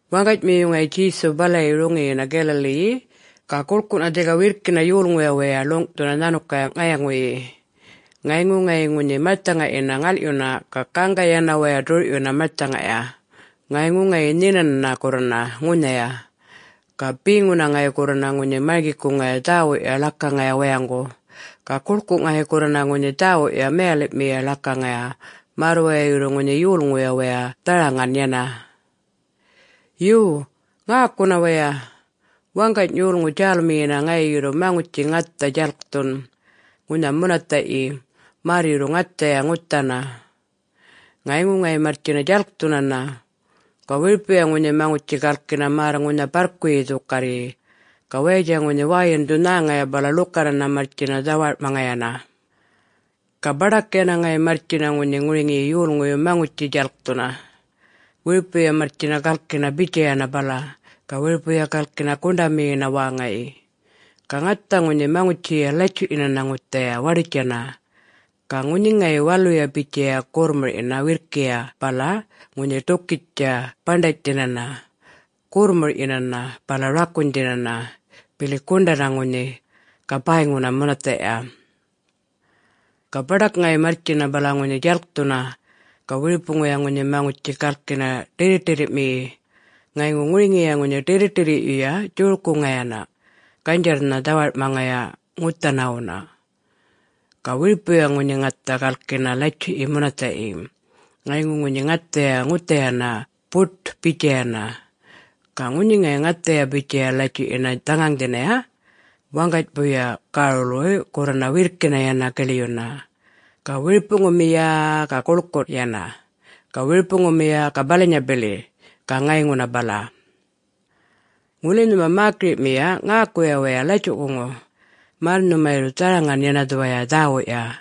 Waŋganymiyu ŋayi Djesu balayi roŋiyina Galilee-yi. Ga guḻkuꞌna dhika wirrkina yolŋuya waya ḻuŋꞌthuna nhanukaya ŋayŋuyi. Ŋayŋu ŋayi ŋunhi marthaŋayina ŋalꞌyuna, ga gaŋga yana waya ḏurꞌyuna marthaŋaya, ŋayŋu ŋayi nhinanana gurrana ŋunhaya. Ga beŋuna ŋayi gurrana ŋunhi marŋgikuŋaya dhäwuꞌya ḻakaŋaya wayaŋgu. Ga guḻkuꞌ ŋayi gurrana ŋunhi dhäwuꞌya mayaliꞌmiya ḻakaŋaya, märr waya yurru ŋunhi yolŋuya wayay dharaŋan yana. “Yo, ŋäkuna waya: Waŋgany yolŋu djälmiyina ŋayi yurru maŋutji ŋatha djalkthun ŋunha munathaꞌyi märr yurru ŋathaya ŋuthana. Ŋayŋu ŋayi marrtjina djalkthunana. Ga wiripuya ŋunhi maŋutji galkina märr ŋunha barrkuyi dhukarryi. Ga wayatja ŋunhi wäyindhu nhäŋaya bala ḻukanana marrtjina dhawarꞌmaŋayana. Ga baḏak yana ŋayi marrtjina ŋunhi ŋuriŋiyi yolŋuyu maŋutji djalkthuna, wiripuya marrtjina galkina bitjayana bala, ga wiripuya galkina guṉḏamiyina wäŋayi. Ga ŋathaya ŋunhi maŋutjiya latjuꞌyinana ŋuthaya waḏutjana, ga ŋunhi ŋayi waluya bitjaya gorrmurꞌyina wirrkiya bala ŋunhi ḏukitja baṉḏanydhinana, gorrmurꞌyinana, bala rakunydhinana, bili guṉḏana ŋunhi, ga bäyŋuna munathaꞌya. Ga baḏak ŋayi marrtjina bala ŋunhi djalkthuna, ga wiripuya ŋunhi maŋutji galkina ḏirriꞌṯirrimiyi. Ŋayŋu ŋuriŋiya ŋunhi ḏirriꞌṯirriyuya djorkuŋayana, ganydjarrnha dhawarꞌmaŋaya ŋuthanawuna. Ga wiripuya ŋunhi ŋatha galkina latjuꞌyi munathaꞌyi. Ŋayŋu ŋunhi ŋathaya ŋuthayana buṯ-bitjayana. Ga ŋunhi ŋayi ŋathaya bitjaya latjuꞌyina dhaŋaŋdhina, waŋganybuya gärulwuy gurrana wirrkina yana giḻyuna. Ga wiripuŋumiya-a-a ga guḻkuꞌ yana, ga wiripuŋumiya ga balanya bili, ga ŋayŋuna bala. Ŋuli nhuma mäkiriꞌmiya, ŋäkuya waya latjuꞌkuŋu, märr nhuma yurru dharaŋan yana dhuwaya dhäwuꞌya.”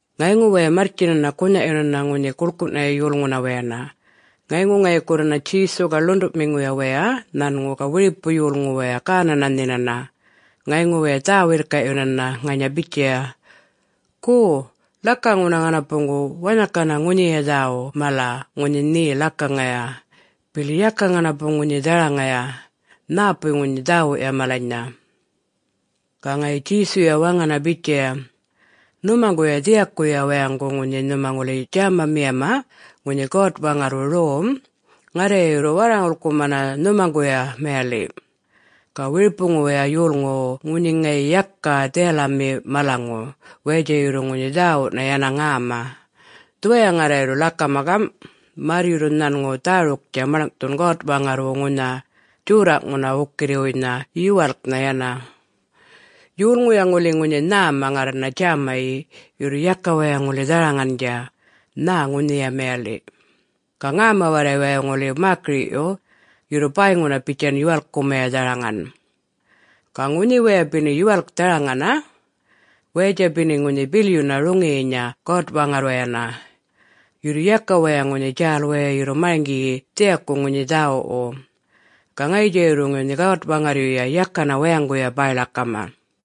Ŋayŋu waya marrtjinana gunhaꞌyunana ŋunhi guḻkuꞌnaya yolŋuna wayana. Ŋayŋu ŋayi gurrana Djesu ga ḻuṉḏuꞌmiŋu waya nhanŋu ga wiripu yolŋu waya gänana nhinana. Ŋayŋu waya dhä-wirrkaꞌyunana ŋanya bitjaya, “Go, ḻakaŋuna ŋanapuŋgu wanhakana ŋunhiya dhäwuꞌ mala ŋunhi nhe ḻakaŋaya, bili yaka ŋanapu ŋunhi dharaŋaya. Nhäpuy ŋunhi dhäwuꞌya malanynha?” Ga ŋayi Djesuya waŋana bitjaya, “Nhumaŋguya dhiyakuya wayaŋgu ŋunhi nhuma ŋuli djämamiyama ŋunhi God-Waŋarrwu rom, ŋarraya yurru warraŋulkumana nhumaŋguya mayaliꞌ. Ga wiripuwuya yolŋuwu ŋunhi ŋayi yaka dhiyalami malaŋu, wayatja yurru ŋunhi dhäwuꞌna yana ŋäma. Dhuwaya ŋarra yurru ḻakama gamꞌ, märr yurru nhanŋu dhäruktja maḻŋꞌthun God-Waŋarrwu ŋunha djorraꞌŋuna wukirriwuynha yuwalknha yana: Yolŋuya ŋuli ŋunhi nhäma ŋarrana djämayi, yurru yaka waya ŋuli dharaŋandja, nhä ŋunhiya mayaliꞌ. Ga ŋäma warray waya ŋuli mäkiriꞌyu, yurru bäyŋuna bitjan yuwalkumaya dharaŋan. Ga ŋunhi waya beni yuwalk dharaŋana, wayatja beni ŋunhi bilyuna roŋiyinya God-Waŋarrwayana. Yurru yaka waya ŋunhi djäl waya yurru marŋgiyi dhiyaku ŋunhi dhäwuꞌwu. Ga ŋayitja yurru ŋunhi God-Waŋarryuya yakana wayaŋguya bäy-ḻakama.”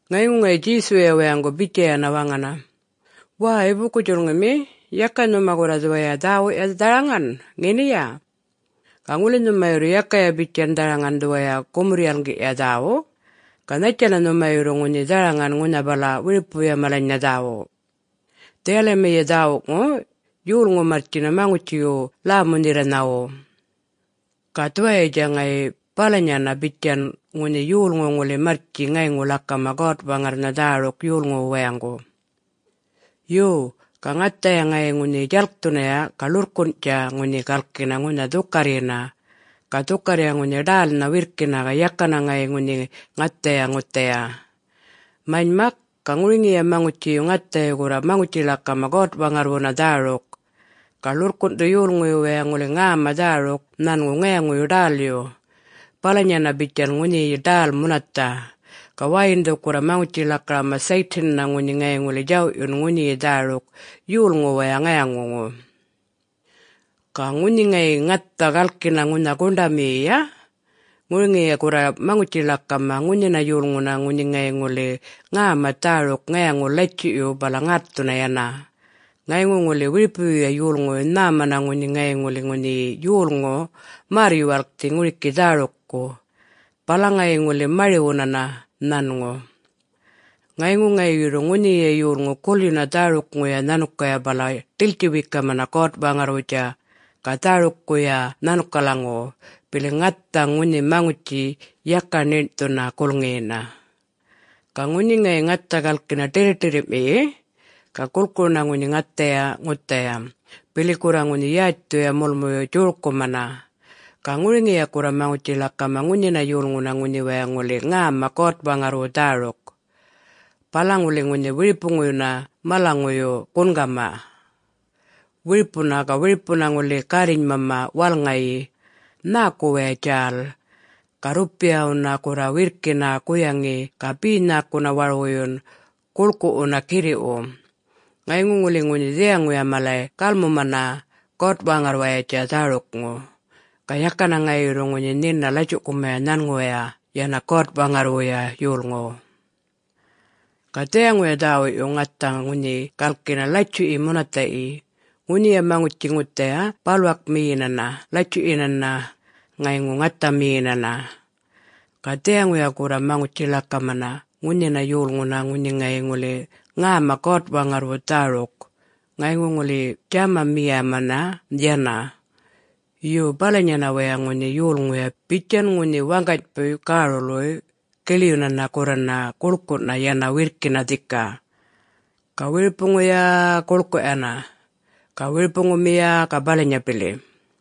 Ŋayŋu ŋayi Djesuya wayaŋgu bitjayana waŋana, “Wäy, buku-djulŋimi, yaka nhuma gurra dhuwaya dhäwuꞌya dharaŋan, ŋeniya? Ga ŋuli nhuma yurru yakaya bitjan dharaŋan dhuwaya gumurr-yalŋgiꞌya dhäwuꞌ, ga nhattjana nhuma yurru ŋunhi dharaŋan ŋunha bala wiripuya malanynha dhäwuꞌ? Dhiyalamiya dhäwuꞌŋu, yolŋu marrtjina maŋutjiwu lämu-nherraṉawu. Ga dhuwayatja ŋayi balanyana, bitjan ŋunhi yolŋu ŋuli marrtji ŋayŋu ḻakama God-Waŋarrnha dhäruk yolŋuwu wayaŋgu. Yo, ga ŋathaya ŋayi ŋunhi djalkthunaya, ga ḻurrkunꞌtja ŋunhi galkina ŋunha dhukarryina. Ga dhukarrya ŋunhi ḏälnha wirrkina ga yakana ŋayi ŋunhi ŋathaya ŋuthaya. Manymak, ga ŋuriŋiya maŋutjiyu ŋathayu gurra maŋutji-ḻakama God-Waŋarrwuna dhäruk. Ga ḻurrkunꞌthu yolŋuyu wayay ŋuli ŋäma dhäruk nhanŋu ŋayaŋuyu ḏälyu, balanyana bitjan ŋunhiyi ḏäl munathaꞌ. Ga wäyindhu gurra maŋutji-ḻakama Satan-na ŋunhi ŋayi ŋuli djawꞌyun ŋunhiyi dhäruk yolŋuwaya ŋayaŋuŋu. Ga ŋunhi ŋayi ŋatha galkina ŋunha guṉḏamiyiya, ŋuriŋiya gurra maŋutji-ḻakama ŋunhina yolŋuna ŋunhi ŋayi ŋuli ŋäma dhäruk ŋayaŋuyu latjuꞌyu bala ŋätthuna yana. Ŋayŋu ŋuli wiripuyuya yolŋuyu nhämana ŋunhi ŋayi ŋuli ŋunhiyi yolŋu märr-yuwalkthi ŋuriki dhärukku, bala ŋayi ŋuli mari-wunana nhanŋu. Ŋayŋu ŋayi yurru ŋunhiya yolŋu gulyuna dhärukŋuya nhanukaya bala ḏiltji-wekamana God-Waŋarrwutja ga dhärukkuya nhanukalaŋuwu, bili ŋatha ŋunhi maŋutji yaka ṉiṉꞌthuna gulŋiyina. Ga ŋunhi ŋayi ŋatha galkina ḏirriꞌṯirrimiyi, ga gulkuruna ŋunhi ŋathaya ŋuthaya, bili gurra ŋunhi yätjthuya mulmuyu djorkumana. Ga ŋuriŋiya gurra maŋutji-ḻakama ŋunhina yolŋuna ŋunhi waya ŋuli ŋäma God-Waŋarrwu dhäruk, bala ŋuli ŋunhi wiripuŋuyuna malanyŋuyu gungama. Wiripuna ga wiripuna ŋuli garrinymama walŋayi, nhäku waya djäl. Ga rrupiyana gurra wirrkina guyaŋi ga be nhäkuna warwuyun, gulkuꞌwuna, girriꞌwu. Ŋayŋu ŋuli ŋunhi dhiyaŋuya malay galmumana God-Waŋarrwayatja dhärukŋu, ga yakana ŋayi yurru ŋunhi nhina latjuꞌkumaya nhanŋuwaya yana God-Waŋarrwuya yolŋu. Ga dhiyaŋuya dhäwuꞌyu, ŋatha ŋunhi galkina latjuꞌyi munathaꞌyi, ŋunhiya maŋutji ŋuthaya balwakmiyinana latjuꞌyinana, ŋayŋu ŋathamiyinana. Ga dhiyaŋuya gurra maŋutji-ḻakama ŋunhina yolŋuna ŋunhi ŋayi ŋuli ŋäma God-Waŋarrwu dhäruk ŋayŋu ŋuli djämamiyamana yana. Yo, balanyana waya ŋunhi yulŋuya bitjan ŋunhi waŋganybuy gärulwuy giḻyunana gurrana guḻkuꞌna yana wirrkina dhika. Ga wiripuŋuya-a-a guḻkuꞌ yana, ga wiripuŋumiya ga balanya bili.”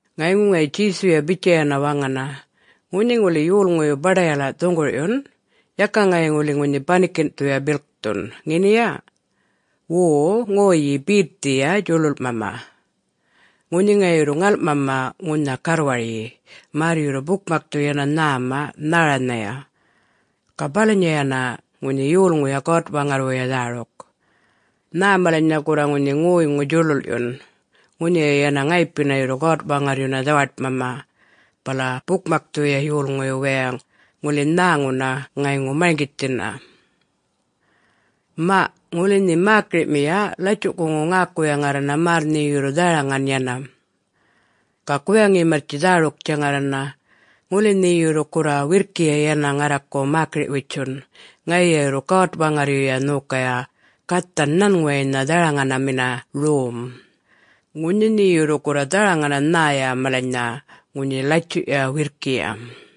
Ŋayŋu ŋayi Djesuya bitjayana waŋana, “Ŋunhi ŋuli yolŋuyu baḏayala dhuŋgurꞌyun, yaka ŋayi ŋuli ŋunhi banikinꞌthuya bilkthun, ŋeniya?... wo ŋoyyi betthiya djuḻuḻꞌmama. Ŋunhi ŋayi yurru ŋalꞌmama ŋunha garrwaryi, märr yurru bukmakthu yana nhäma nhäranhaya. Ga balanyana ŋunhi yulŋuya God-Waŋarrwuya dhäruk. Nhä malanynha gurra ŋunhi ŋoyŋu djuḻuḻꞌyun, ŋunhiya yana ŋayipina yurru God-Waŋarryuna dhawaṯmama, bala bukmakthuya yolŋuyu wayay ŋuli nhäŋuna ŋayŋu marŋgithina. Maꞌ, ŋuli nhe mäkiriꞌmiya latjuꞌkuŋu ŋäkuya ŋarrana märr nhe yurru dharaŋan yana. Ga guyaŋi marrtji dhäruktja ŋarrana. Ŋuli nhe yurru gurra wirrkiya yana ŋarraku mäkiriꞌ-witjun, ŋayiya yurru God-Waŋarryuya nhokaya gathan nhanŋuwaynha dharaŋanami rom, ŋunhi nhe yurru gurra dharaŋana nhäya malanynha ŋunhi latjuꞌya wirrkiya.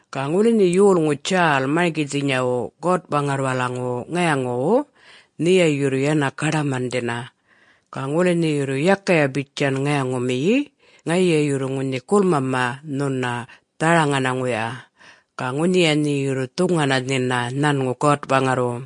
Ga ŋuli nhe yolŋu djäl marŋgithinyawu God-Waŋarrwalaŋuwu ŋayaŋuwu, nheya yurru yana gaḏamandhina. Ga ŋuli nhe yurru yakaya bitjan ŋayaŋumiyi, ŋayiya yurru ŋunhi guḻmamana nhuna dharaŋanaŋuya, ga ŋunhiya nhe yurru dhuŋana nhina nhanŋu God-Waŋarrwu.”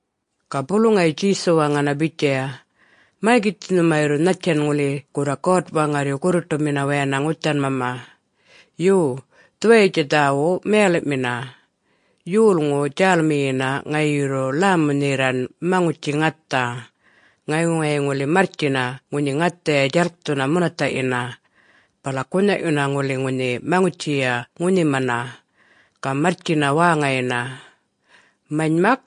Ga bulu ŋayi Djesu waŋana bitjaya, “Marŋgithi nhuma yurru nhattjan ŋuli gurra God-Waŋarryu gurruṯumina wayana ŋuthanmama. Yo, dhuwayatja dhäwuꞌ mayaliꞌmina: Yolŋu djälmiyina ŋayi yurru ḻämu-nherraṉ maŋutji ŋatha, ŋayŋu ŋayi ŋuli marrtjina ŋunhi ŋathaya djalkthuna munathaꞌyina, bala gunhaꞌyuna ŋuli ŋunhi maŋutjiya ŋunhimana, ga marrtjina wäŋayina. Manymak,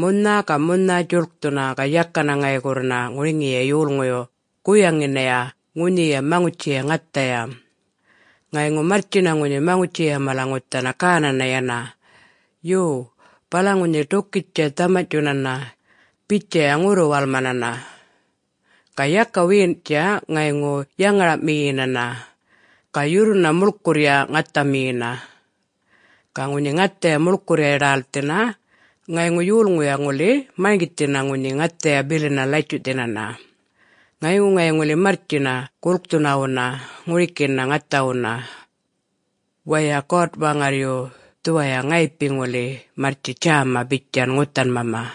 munha ga munha djuḻkthuna ga yakana ŋayi gurrana ŋuriŋiya yolŋuyu guyaŋinaya ŋunhiya maŋutjiya ŋathaya. Ŋayŋu marrtjina ŋunhi maŋutjiya mala ŋuthana gänana yana. Yo, bala ŋunhi ḏukitja dhamanyꞌtjunana, bitjaya ŋurru-walmanana. Ga yaka wiyinꞌtja, ŋayŋu yaŋaraꞌmiyinana, ga yurruna muḻkurrya ŋathamiyina. Ga ŋunhi ŋathaya muḻkurrya ḏälthina, ŋayŋu yolŋuya ŋuli marŋgithina ŋunhi ŋathaya bilina latjuꞌthinana, ŋayŋu ŋayi ŋuli marrtjina gulkthunawuna ŋurikina ŋathawuna. Waya, God-Waŋarryu dhuwaya ŋayipi ŋuli marrtji djäma bitjan ŋuthanmama.”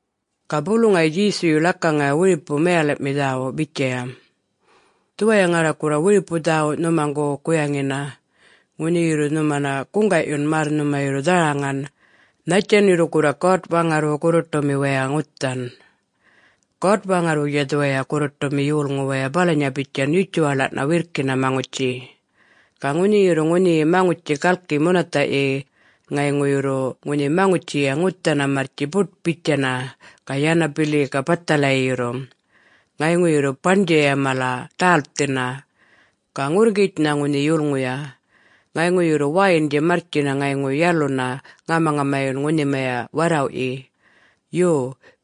Ga bulu ŋayi Djesuyu ḻakaŋaya wiripu mayaliꞌmi dhäwuꞌ bitjaya, “Dhuwaya ŋarra gurra wiripu dhäwuꞌ nhumaŋgu guyaŋina, ŋunhi yurru nhumana guŋgaꞌyun märr nhuma yurru dharaŋan, nhattjan yurru gurra God-Waŋarrwu gurruṯumi waya ŋuthan. God-Waŋarrwutja dhuwaya gurruṯumi yolŋu waya balanya bitjan yutjuwaḻaꞌna wirrkina maŋutji. Ga ŋunhi yurru ŋunhiyi maŋutji galki munathaꞌyi ŋayŋu yurru ŋunhi maŋutjiya ŋuthana marrtji buṯ-bitjana ga yana bili ga bathalayi yurru, ŋayŋu yurru baṉdjaya mala ḏälthina. Ga ŋurrŋgitjnha ŋunhi yulŋuya. Ŋayŋu yurru wäyindja marrtjina ŋayŋu yaluna ŋamaŋamayun ŋunhimaya warrawꞌyi. Yo,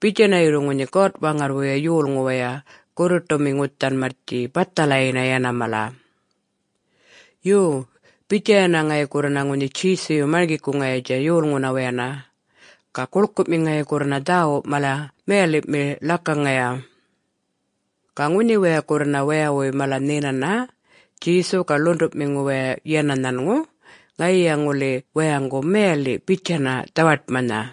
bitjana yurru ŋunhi God-Waŋarrwuya yolŋu waya gurruṯumi ŋuthan marrtji, bathalayina yana mala.” Yo, bitjayana ŋayi gurrana ŋunhi Djesuyu marŋgikuŋayatja yolŋuna wayana. Ga guḻkuꞌmi ŋayi gurrana dhäwuꞌ mala mayaliꞌmi ḻakaŋaya. Ga ŋunhi waya gurrana wayawuy mala nhinana, Djesu ga ḻuṉḏuꞌmiŋu waya yana nhanŋu, ŋayiya ŋuli wayaŋgu mayaliꞌ bitjana dhawaṯmanha.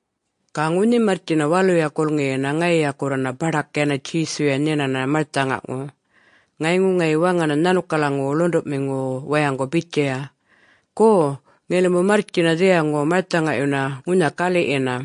Ga ŋunhi marrtjina waluya gulŋiyina ŋayiya gurrana baḏak yana Djesuya nhinana marthaŋaŋu. Ŋayŋu ŋayi waŋana nhanukalaŋuwu ḻuṉḏuꞌmiŋuwu wayaŋgu bitjaya, “Go, ŋilimu marrtjina dhiyaŋu marthaŋayuna ŋunha galiꞌyina.”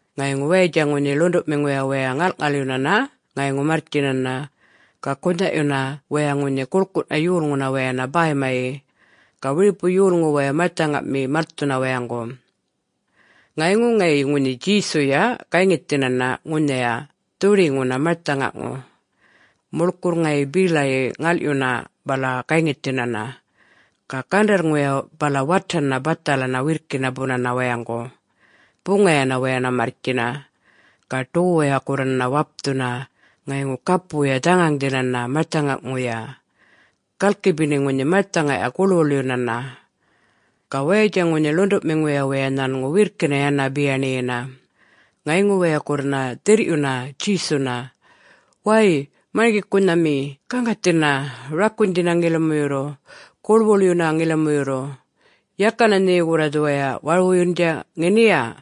Ŋayŋu wayatja ŋunhi ḻuṉḏuꞌmiŋuya waya ŋalꞌŋalyunana ŋayŋu marrtjinana. Ga gunhaꞌyuna waya ŋunhi guḻkuꞌna yolŋuna wayana bäymayi. Ga wiripu yolŋu waya marthaŋami malthuna wayaŋgu. Ŋayŋu ŋayi ŋunhi Djesuya gayŋithinana ŋunhaya dhuḏiŋuna marthaŋaŋu, muḻkurr ŋayi belayi ŋalꞌyuna bala gayŋithinana. Ga gandarrŋuya bala watana bathalana wirrkina bunana wayaŋgu, buŋayana wayana marrtjina, ga ḏowuya gurrana wapthuna ŋayŋu gapuya dhaŋaŋdhinana marthaŋaŋuya, galki beni ŋunhi marthaŋaya guḻwuḻyunana. Ga wayatja ŋunhi ḻuṉḏuꞌmiŋuya waya nhanŋu wirrkina yana biyaṉiyina, ŋayŋu waya gurrana dhirrꞌyuna Djesuna, “Wäy Marŋgikunhami gaŋgathina, rakunydhina ŋilimu yurru, guḻwuḻyuna ŋilimu yurru... yakana nhe gurra dhuwaya warwuyundja, ŋeniya?”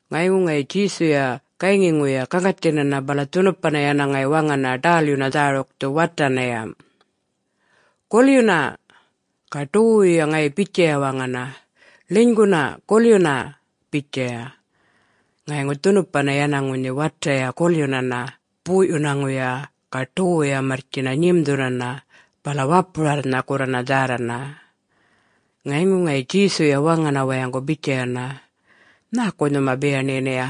Ŋayŋu ŋayi Djesuya gayŋiŋuya gaŋgathinana bala dhunupa yana ŋayi waŋana ḏälyuna dhärukthu watanaya, “Gulyuna!” ga ḏowuwuya ŋayi bitjaya waŋana, “Ḻinyguna gulyuna!” bitjaya. Ŋayŋu dhunupa yana ŋunhi wataya gulyunana boꞌyunaŋuya ga ḏowuya marrtjina nyimdhunana bala wapurarrnha gurrana dhärrana. Ŋayŋu ŋayi Djesuya waŋana wayaŋgu bitjayana, “Nhäku nhuma biyaṉiyinaya?...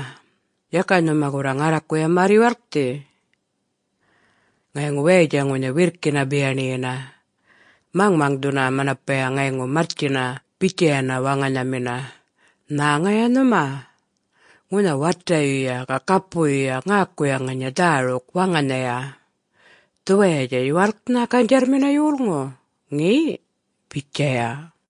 yaka nhuma gurra ŋarrakuya märr-yuwalkthi?” Ŋayŋu wayatja ŋunhi wirrkina biyaṉiyina, maŋmaŋdhuna manapaya ŋayŋu marrtjina bitjayana waŋanhamina, “Nhäŋaya nhuma? Ŋunha watayuya ga gapuyuya ŋäkuya ŋanya dhäruk waŋanhaya! Dhuwayatja yuwalknha ganydjarrmina yolŋu!... ŋe?” bitjaya.